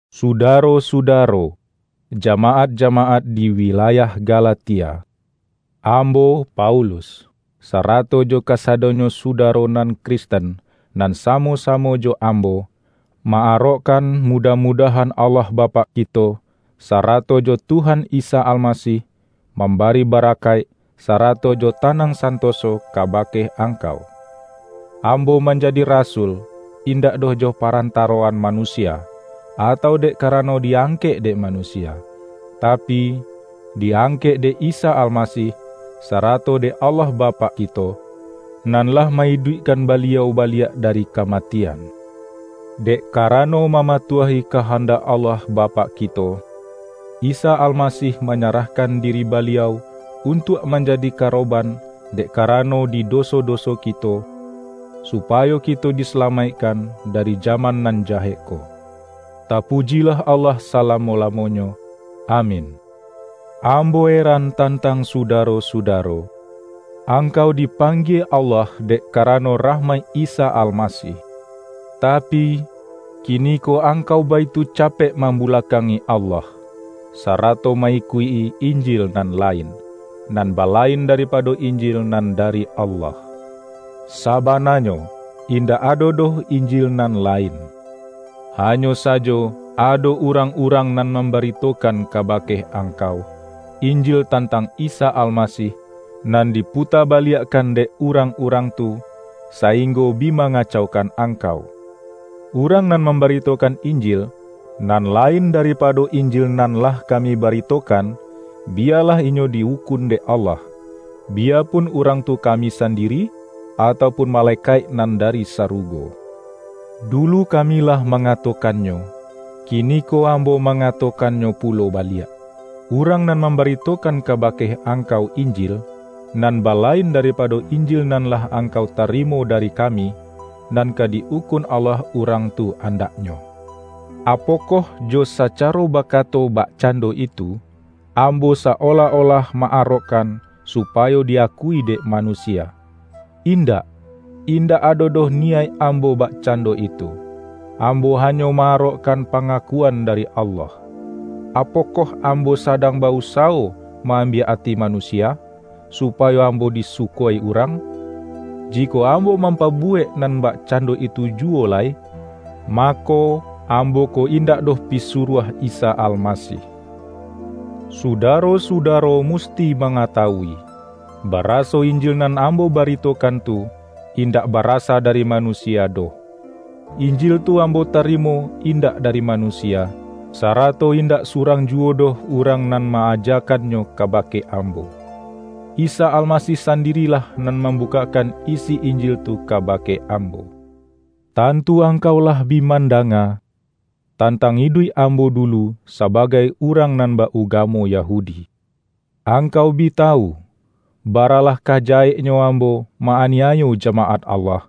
Sudaro-sudaro, jamaat-jamaat di wilayah Galatia, ambo Paulus, sarato jo kasadonyo sudaro nan Kristen nan samo-samo jo ambo, ma-arokkan mudah-mudahan Allah Bapak kito, sa-rato jo Tuhan Isa Almasih, mambari barakaik sarato jo tanang santoso ka-bake angkau. Ambo manjadi rasul, indak doh jo parantaroan manusia, atau dek karano di-angkek dek manusia, tapi, di-ang-kek dek Isa Almasih sarato dek Allah Bapak kito, nan lah ma-iduikkan Ba-liau baliak dari kamatian. Dek ka-rano mamatuahi kahandak Allah Ba-pak kito, Isa Almasih manyarahkan diri Baliau, untuak manjadi karoban dek karano di doso-doso kito, supayo kito disalamaikkan dari jaman nan jahek ko. Tapujilah Allah salamo-lamonyo! Amin. Ambo eran tantang sudaro-sudaro! Angkau dipanggie Allah dek karano rahmaik Isa Almasih, tapi, kiniko ang-kau baitu capek mambulakangi Allah, sarato ma-ikuik-i”injil” nan lain, nan balain daripado Injil nan dari Allah. Sabananyo, indak ado doh”injil nan lain”. Hanyo sajo ado urang-urang nan mambaritokan kabake angkau,”injil” tantang Isa Almasih, nan diputa ba-liakkan dek urang-urang tu, sainggo bi mangacaukan angkau. Urang nan mambaritokan”injil”, nan lain daripa-do Injil nan lah kami baritokan, biya-lah inyo di-ukun dek Allah — biyapun urang tu kami sandiri, atau pun ma-lekaik nan dari sarugo! Dulu kami lah mangatokannyo, kiniko ambo ma-ngatokannyo pulo baliak: Urang nan mambaritokan kabake angkau”injil”, nan balain daripado Injil nan lah ang-kau tarimo dari kami, nan ka di-ukun Allah urang tu andaknyo! Apokoh jo sacaro bakato bakcan-do itu, ambo sa-olah-olah ma-arokkan supayo di-akui dek manusia? Indak, indak ado doh niyaik ambo bakcando itu! Ambo hanyo ma-arokkan panga-kuan dari Allah. Apokoh ambo sadang ba-usawo ma-ambiak ati manusia, su-payo ambo disuko-i urang? Jikok am-bo mampabuwek nan bakcando itu juwo lai, mako, ambo ko indak doh pisuruah Isa Almasih. Sudaro-sudaro musti mangatawui, baraso Injil nan ambo baritokan tu, in-dak barasa dari manusia doh. Injil tu ambo tarimo indak dari manusia, sarato indak surang juwo doh urang nan ma-ajakannyo kabake ambo. Isa Almasih sandirilah nan mambukak-kan isi Injil tu kabake ambo. Tantu angkau lah bi mandanga, tantang iduik ambo dulu sabagai urang nan ba-ugamo Yahudi. Angkau bi tawu, baralah ka jaheknyo ambo ma-aniayo jamaat Allah,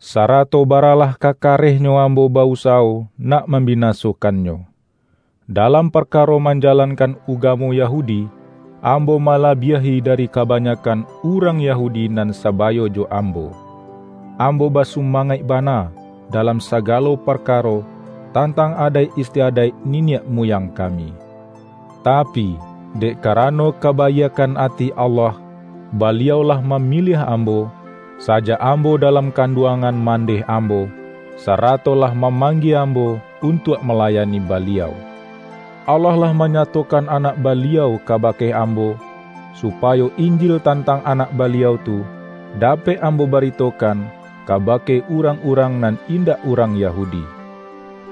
sarato baralah ka kareh-nyo ambo ba-usawo nak mambinaso-kannyo. Dalam parkaro manjalankan ugamo Yahudi, ambo malabiahi dari kabanyakkan urang Yahudi nan saba-yo jo ambo. Ambo basumangaik bana, dalam sagalo parkaro tantang adaik istiadaik niniak muyang kami. Tapi, dek karano kabaiakkan ati Allah, Baliau lah mamiliah ambo, sa-jak ambo dalam kanduangan man-deh ambo, sarato lah mamanggie am-bo untuak malayani Baliau. Allah lah manyatokan Anak Baliau kaba-ke ambo, supayo Injil tantang Anak Baliau tu, dapek ambo baritokan ka-bake urang-urang nan indak urang Ya-hudi.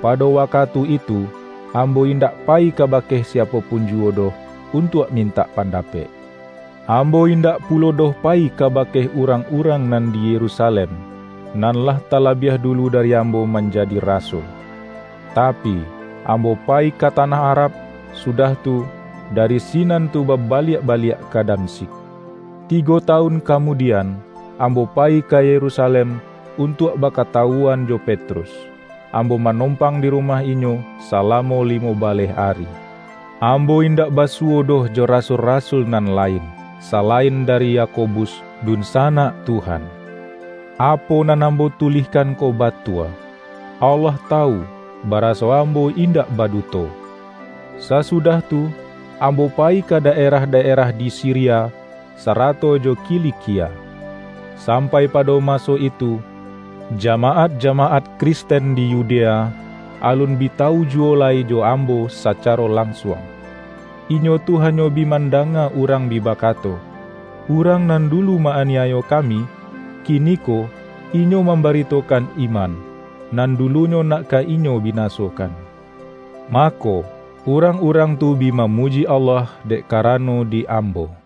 Pado wakatu itu, ambo indak pa-yi kabake siapo pun juwo doh untuak mintak pandapek. Ambo indak pu-lo doh payi kabake urang-urang nan di Yerusalem, nan lah talabiah dulu dari ambo manjadi rasul. Tapi, ambo payi ka tanah Arab, sudah tu, dari si-nan tu babaliak baliak ka Damsyik. Tigo tawun kamudian, ambo payi ka Yerusalem untuak bakatawuan jo Petrus. Ambo manompang di rumah inyo salamo limo baleh ari. Ambo indak basuwo doh jo rasul-rasul nan lain, salain dari Yakobus, dunsanak Tuhan. Apo nan ambo tulihkan ko ba-tua. Allah tawu, baraso ambo indak baduto! Sasudah tu, ambo payi ka da-erah-daerah di Siria, sarato jo Kilikia. Sampai pado maso itu, jamaat-jama-at Kristen di Yudea, alun bi tawujuwo lai jo ambo sacaro lansuang. Inyo tu hanyo bi mandanga urang bi ba-kato,”Urang nan dulu ma-aniayo ka-mi, kiniko inyo mambaritokan iman, nan dulunyo nak ka inyo binasokan.” Mako, urang-urang tu bi mamuji Allah dek karano di ambo.